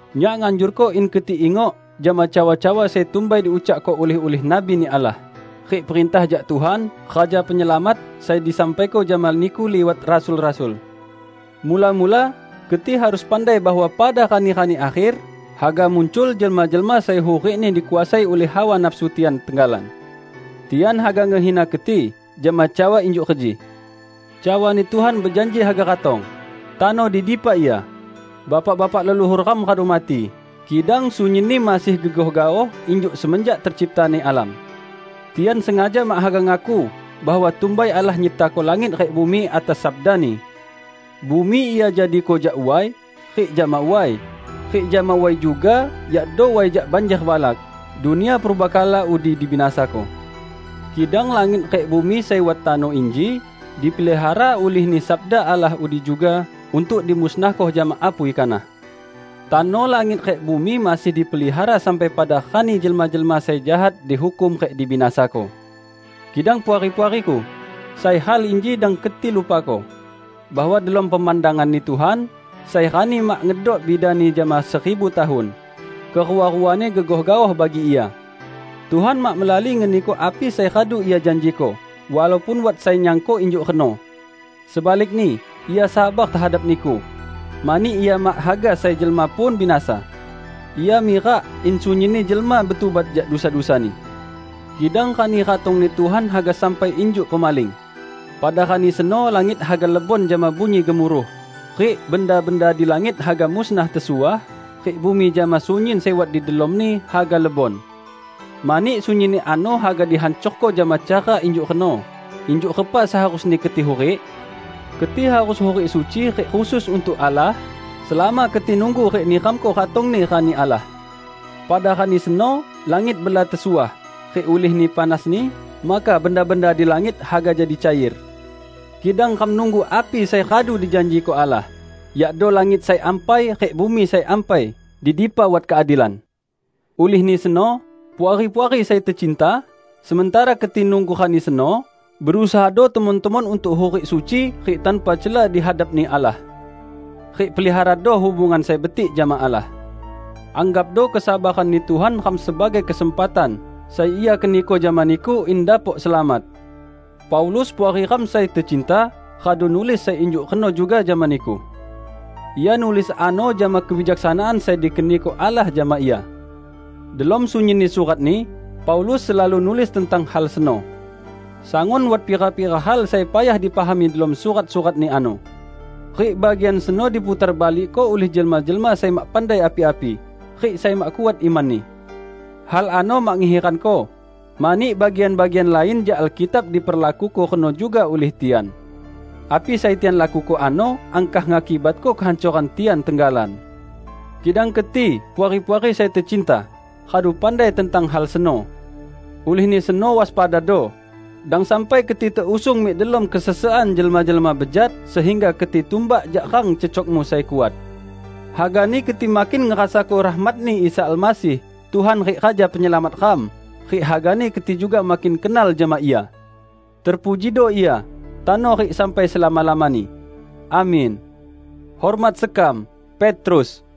Nyak nganjurko in keti ingok jama cawa-cawa sai tumbai diucakko ulih-ulih nabi-Ni Allah, rik perintah jak Tuhan, Raja Penyelamat, sai disampaiko jama niku liwat rasul-rasul. Mula-mula, keti harus pandai bahwa pada rani-rani akher, haga muncul jelma-jelma sai hurikni dikuasai ulih hawa nafsu tian tenggalan. Tian haga ngehina keti jama cawa injuk reji, "Cawani Tuhan bejanji haga ratong! Tano di dipa Ia? Bapak-bapak leluhur ram radu mati, kidang sunyinni masih gegoh gaoh injuk semenjak terciptani alam!" Tian sengaja mak haga ngaku bahwa tumbai Allah nyiptako langit rik bumi atas sabda-Ni. Bumi Ia jadiko jak way, rik jama way, rik jama way juga -- yakdo way jak banjer balak -- dunia purbakala udi dibinasako. Kidang langit rik bumi sai wat tano inji, dipelihara ulih-Ni sabda Allah udi juga untuk dimusnahko jama apui kanah. Tano langit rik bumi masih dipelihara sampai pada rani jelma-jelma sai jahat dihukum rik dibinasako. Kidang puari-puariku, sai hal inji dang keti lupako: bahwa delom pemandangan-Ni Tuhan, sai rani mak ngedok bidani jama seribu tahun -- kerua-ruani gegoh gaoh bagi Ia. Tuhan mak melali ngeniko api sai radu Ia janjiko walaupun wat sai nyangko injuk reno. Sebalikni, Ia sabar tehadap niku, mani Ia mak haga sai jelma pun binasa. Ia mirak in sunyinni jelma betubat jak dusa-dusani. Kidang Rani ratong-Ni Tuhan haga sampai injuk pemaling. Pada Rani seno langit haga lebon jama bunyi gemuruh, rik benda-benda di langit haga musnah tesuah, rik bumi jama sunyin sai wat di delomni haga lebon. Mani sunyinni ano haga dihancorko jama cara injuk reno, injuk repa seharusni keti hurik? Keti harus hurik suci rik khusus untuk Allah, selama keti nunggu rik niramko ratong-Ni Rani Allah. Pada Rani seno langit bela tesuah, rik ulihni panasni, maka benda-benda di langit haga jadi cair. Kidang ram nunggu api sai radu dijanjiko Allah, yakdo langit sai ampai rik bumi sai ampai, di dipa wat keadilan. Ulihni seno, Puari-puari sai tecinta, sementara keti nunggu Rani seno, berusahado temon-temon untuk hurik suci rik tanpa cela di hadap-Ni Allah. Rik peliharado hubungan sai betik jama Allah. Anggapdo kesabaran-Ni Tuhan ram sebagai kesempatan sai Ia keniko jama niku in dapok selamat. Paulus, puari ram sai tecinta, radu nulis sai injuk reno juga jama niku. Ia nulis ano jama kebijaksanaan sai dikeniko Allah jama ia. Delom sunyinni suratni, Paulus selalu nulis tentang hal seno. Sangun wat pira-pira hal sai payah dipahami delom surat-suratni ano. Rik bagian seno diputarbalikko ulih jelma-jelma sai mak pandai api-api rik sai mak kuat imanni. Hal ano mak ngehiranko, mani bagian-bagian lain jak Alkitab diperlakuko reno juga ulih tian. Api sai tian lakuko ano angkah ngakibatko kehancoran tian tenggalan. Kidang keti, Puari-puari sai tecinta, radu pandai tentang hal seno. Ulihni seno waspadado, dang sampai keti teusung mik delom kesesekan jelma-jelma bejat sehingga keti tumbak jak rang cecokmu sai kuat. Hagani keti makin ngerasako rahmat-Ni Isa Almasih, Tuhan rik Raja Penyelamat ram, rik hagani keti juga makin kenal jama Ia. Terpujido Ia, tano rik sampai selama-lamani! Amin. Hormat sekam, Petrus